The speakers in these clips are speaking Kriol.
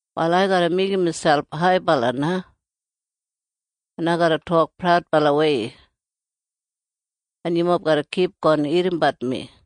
Wal ai garra meigim miselp haibala na, en ai garra tok praudbalawei. En yumob garra kipgon irrimbat mi.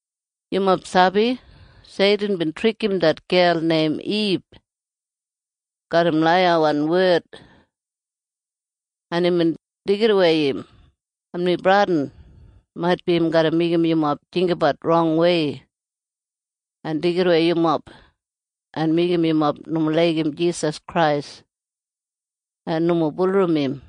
Yumob sabi? Seitin bin trikim det gel neim Ib garram laiyawan wed, en imbin deigidawei im. En mi bradin maitbi im garra meigim yumob jinggabat rongwei en deigidawei yumob en meigim yumob nomo laigim Jisas Krais en nomo bulurrum im.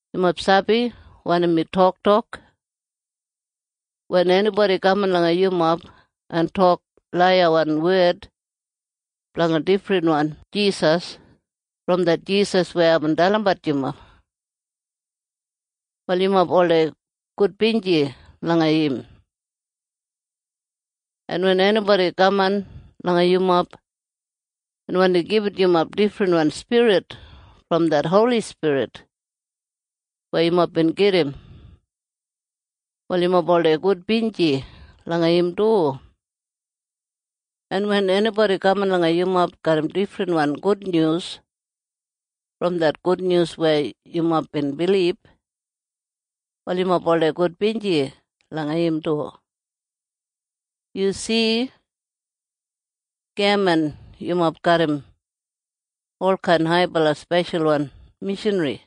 Yumob sabi wanim mi toktok? Wen enibodi kaman langa yumob en tok laiyawan wed blanga difrinwan Jisas brom det Jisas weya aibin dalimbat yumob, wal yumob oldei gudbinji langa im. En wen enibodi kaman langa yumob en wandi gibit yumob difrinwan spirit brom det Holi Spirit weya yumob bin gedim, wal yumob oldei gudbinji langa im du. En wen enibodi kaman langa yumob garram difrinwan gudnyus brom det gudnyus weya yumob bin bilib, wal yumob oldei gudbinji langa im du. Yu si? Geman yumob garram olkain haibala speshalwan mishanri.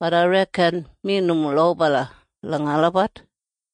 Bat ai reken mi nomo lobala langa olabat.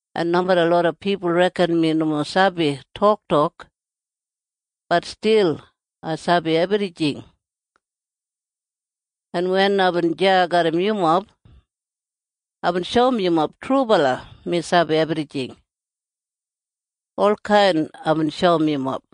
En nomeda loda pipul reken mi nomo sabi toktok, bat stil ai sabi ebrijing. En wen aibin deya garram yumob, aibin shoum yumob trubala mi sabi ebrijing. Olkain aibin shoum yumob.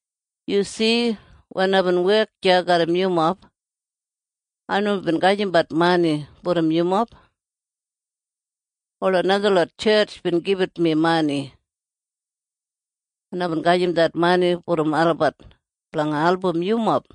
Yu si? Wen aibin wek deya garram yumob, ai nomo bin gajimbat mani brom yumob. Ola najalot tjetj bin gibit mi mani, en aibin gajim det mani brom olabat blanga album yumob.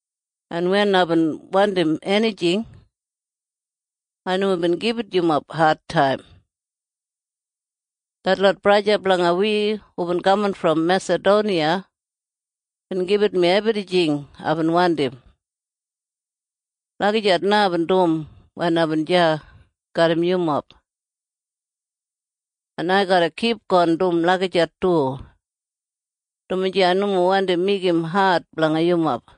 En wen aibin wandim enijing, ai nomo bin gibit yumob adtaim. Detlot braja en sista blanga wi hubin kaman brom Mesadoniya bin gibit mi ebrijing aibin wandim. Lagijat na aibin dum wen aibin deya garram yumob. En ai garra kipgon dum lagijat du, dumaji ai nomo wandi meigim ad blanga yumob.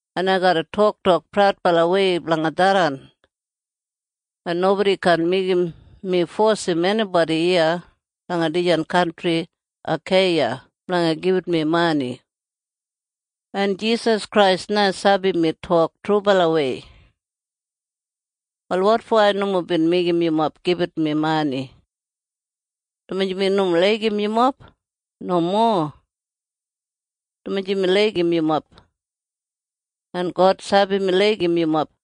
En ai garra toktok praudbalawei blanga tharran. En nobodi kaan meigim mi fosim enibodi iya langa dijan kantri Akeiya blanga gibit mi mani. En Jisas Krais na sabi mi tok trubalawei. Wal wotfo ai nomo bin meigim yumob gibit mi mani? Dumaji mi nomo laigim yumob? Nomo. Dumaji mi laigim yumob. En God sabi mi laigim yumob.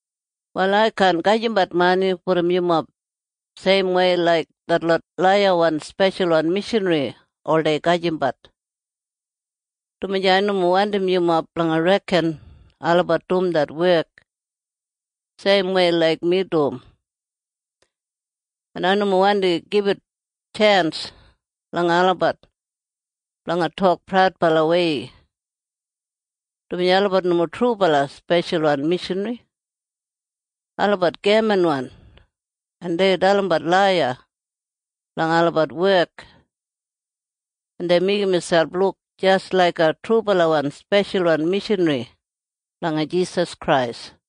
Wal ai kaan gajimbat mani brom yumob seimwei laik detlot laiyawan speshalwan mishanri oldei gajimbat, dumaji ai nomo wandim yumob blanga reken olabat dum det wek seimwei laik mi dum. En ai nomo wandi gibit tjens langa olabat blanga tok praudbalawei, dumaji olabat nomo trubala speshalwan mishanri. Olabat gemanwan, en dei dalimbat laiya blanga olabat wek, en dei meigim miselp luk jis laiga trubalawan speshalwan mishanri blanga Jisas Krais.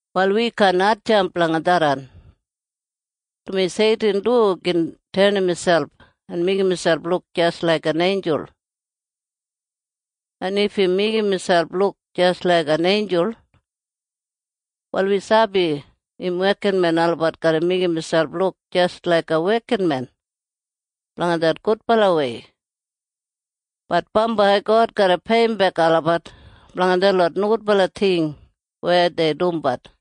Wal wi kaan hatjamp blanga tharran, dumaji Seitin du gin tenim miselp en meigim miselp luk jis laiga einjul. En if im meigim miselp luk jis laiga einjul, wal wi sabi im wekinmen olabat garra meigim miselp luk jis laiga wekinmen blanga det gudbalawei. Bat bambai God garra peiyimbek olabat blanga detlot nogudbala ting weya dei dumbat.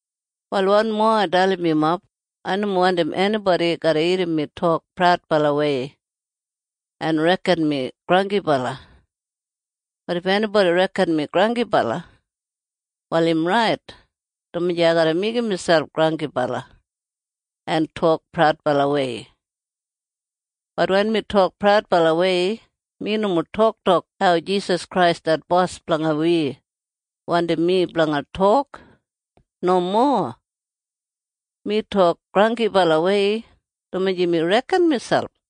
Wal wanmo ai dalim yumob. Ai nomo wandim enibodi garra irrim mi tok praudbalawei en reken mi granggibala. Bat if enibodi reken mi granggibala, wal im rait, dumaji ai garra meigim miselp granggibala en tok praudbalawei. Bat wen mi tok praudbalawei, mi nomo toktok hau Jisas Krais det Bos blanga wi wandim mi blanga tok. Nomo. Mi tok granggibalawei, dumaji mi reken miselp.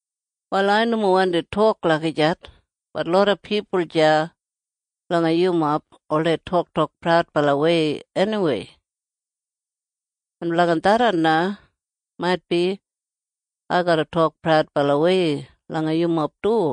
Wal ai nomo wandi tok lagijat. Bat loda pipul deya langa yumob oldei toktok praudbalawei eniwei. En blanga tharran na maitbi ai garra tok praudbalawei langa yumob du.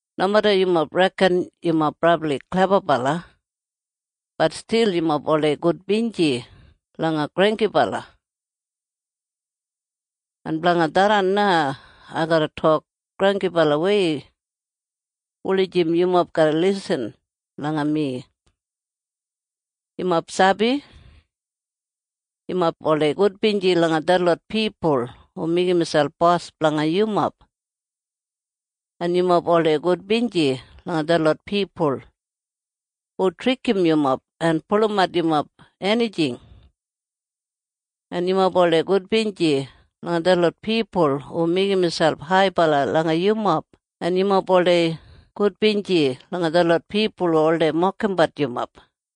Nomeda yumob reken yumob brabli klebabala, bat stil yumob oldei gudbinji langa granggibala. En blanga tharran na ai garra tok granggibalawei wulijim yumob garra lisin langa mi. Yumob sabi? Yumob oldei gudbinji langa detlot pipul hu meigim miselp bos blanga yumob, en yumob oldei gudbinji langa detlot pipul hu trikim yumob en pulumat yumob enijing, en yumob oldei gudbinji langa detlot pipul hu meigim miselp haibala langa yumob, en yumob oldei gudbinji langa detlot pipul hu oldei mokimbat yumob.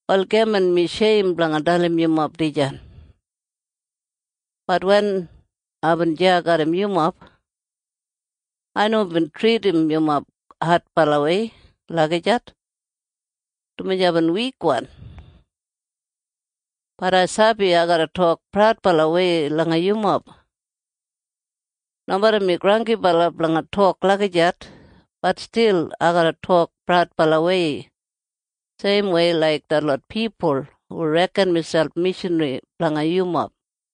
Wal geman mi sheim blanga dalim yumob dijan. Bat wen aibin deya garram yumob, ai nomo bin tridim yumob adbalawei lagijat, dumaji aibin wikwan. Bat ai sabi ai garra tok praudbalawei langa yumob. Nomeda mi granggibala blanga tok lagijat, bat stil ai garra tok praudbalawei seimwei laik detlot pipul hu reken miselp mishanri blanga yumob.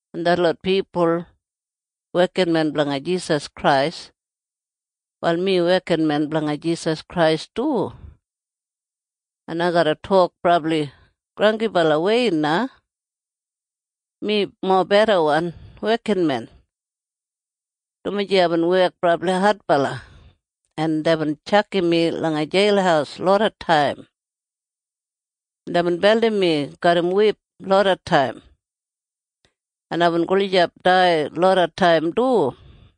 En detlot pipul wekinmen blanga Jisas Krais? Wal mi wekinmen blanga Jisas Krais du. En ai garra tok brabli granggibalawei na. Mi mobedawan wekinmen, dumaji aibin wek brabli adbala, en deibin tjakam mi langa jeil lodataim, en deibin beldim mi garram wip lodataim, en aibin gulijap dai lodataim du.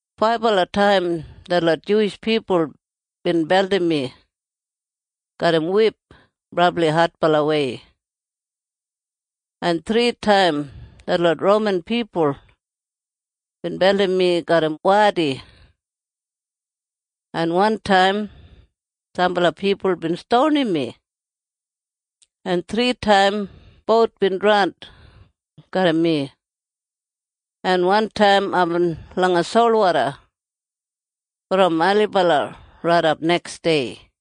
Faibala taim detlot Juwish pipul bin beldim mi garram wip brabli adbalawei, en thritaim detlot Roman pipul bin beldim mi garram wadi, en wantaim sambala pipul bin stonim mi, en thritaim bout bin draun garram mi, en wantaim aibin langa solwoda brom ailibala raidap neksdei.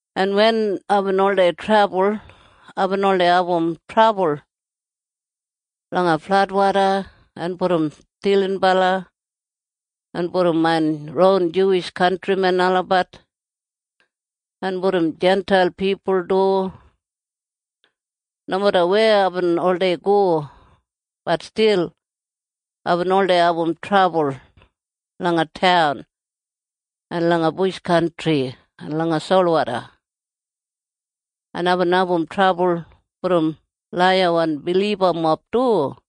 En wen aibin oldei trebul, aibin oldei abum trabul langa fladwoda en brom stilinbala en brom main ron Juwish kantrimen olabat en brom Jintail pipul du. Nomeda weya aibin oldei go, bat stil aibin oldei abum trabul langa taun en langa bush kantri en langa solwoda. En aibin abum trabul brom laiyawan bilibamob du.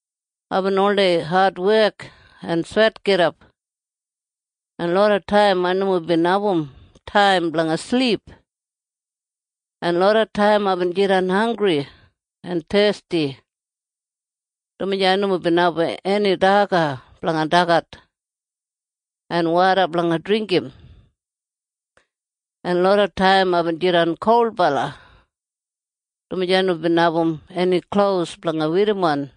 Aibin oldei adwek en swetgidap, en lodataim ai nomo bin abum taim blanga silip. En lodataim aibin jidan hanggri en thesti, dumaji ai nomo bin abum eni daga blanga dagat en woda blanga dringgim. En lodataim aibin jidan kolbala, dumaji ai nomo bin abum eni klos blanga werrimon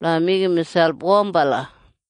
blanga meigim miselp wombala.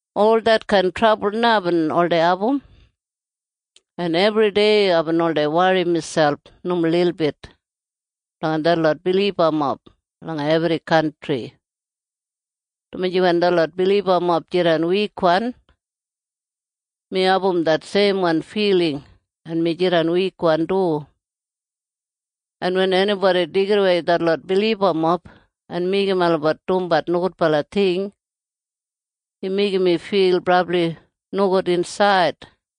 Ol detkain trabul na aibin oldei abum. En ebridei aibin oldei wori miselp nomo lilbit blanga detlot bilibamob langa ebri kantri, dumaji wen detlot bilibamob jidan wikwan, mi abum det seimwan filing en mi jidan wikwan du. En wen enibodi deigidawei detlot bilibamob en meigim olabat dumbat nogudbala ting, im meigim mi fil brabli nogud insaid.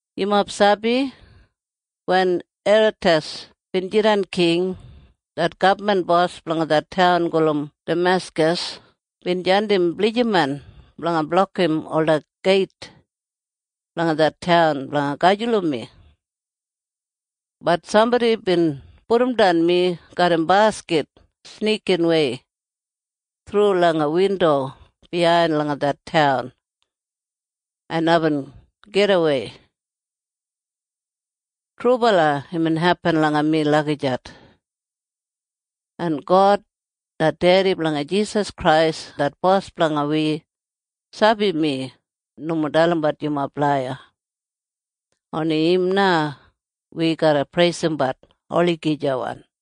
Yumob sabi? Wen Eretas bin jidan king, det gabman bos blanga det taun gulum Dameskas bin jandim blijiman blanga blokim ola geit blanga det taun blanga gajulum mi. Bat sambodi bin pudumdan mi garram baskit snikinwei thru langa windo biyain langa det taun, en aibin gidawei. Trubala imbin hepin langa mi lagijat. En God det dedi blanga Jisas Krais det Bos blanga wi sabi mi nomo dalimbat yumob laiya. Oni im na wi garra preisimbat olagijawan.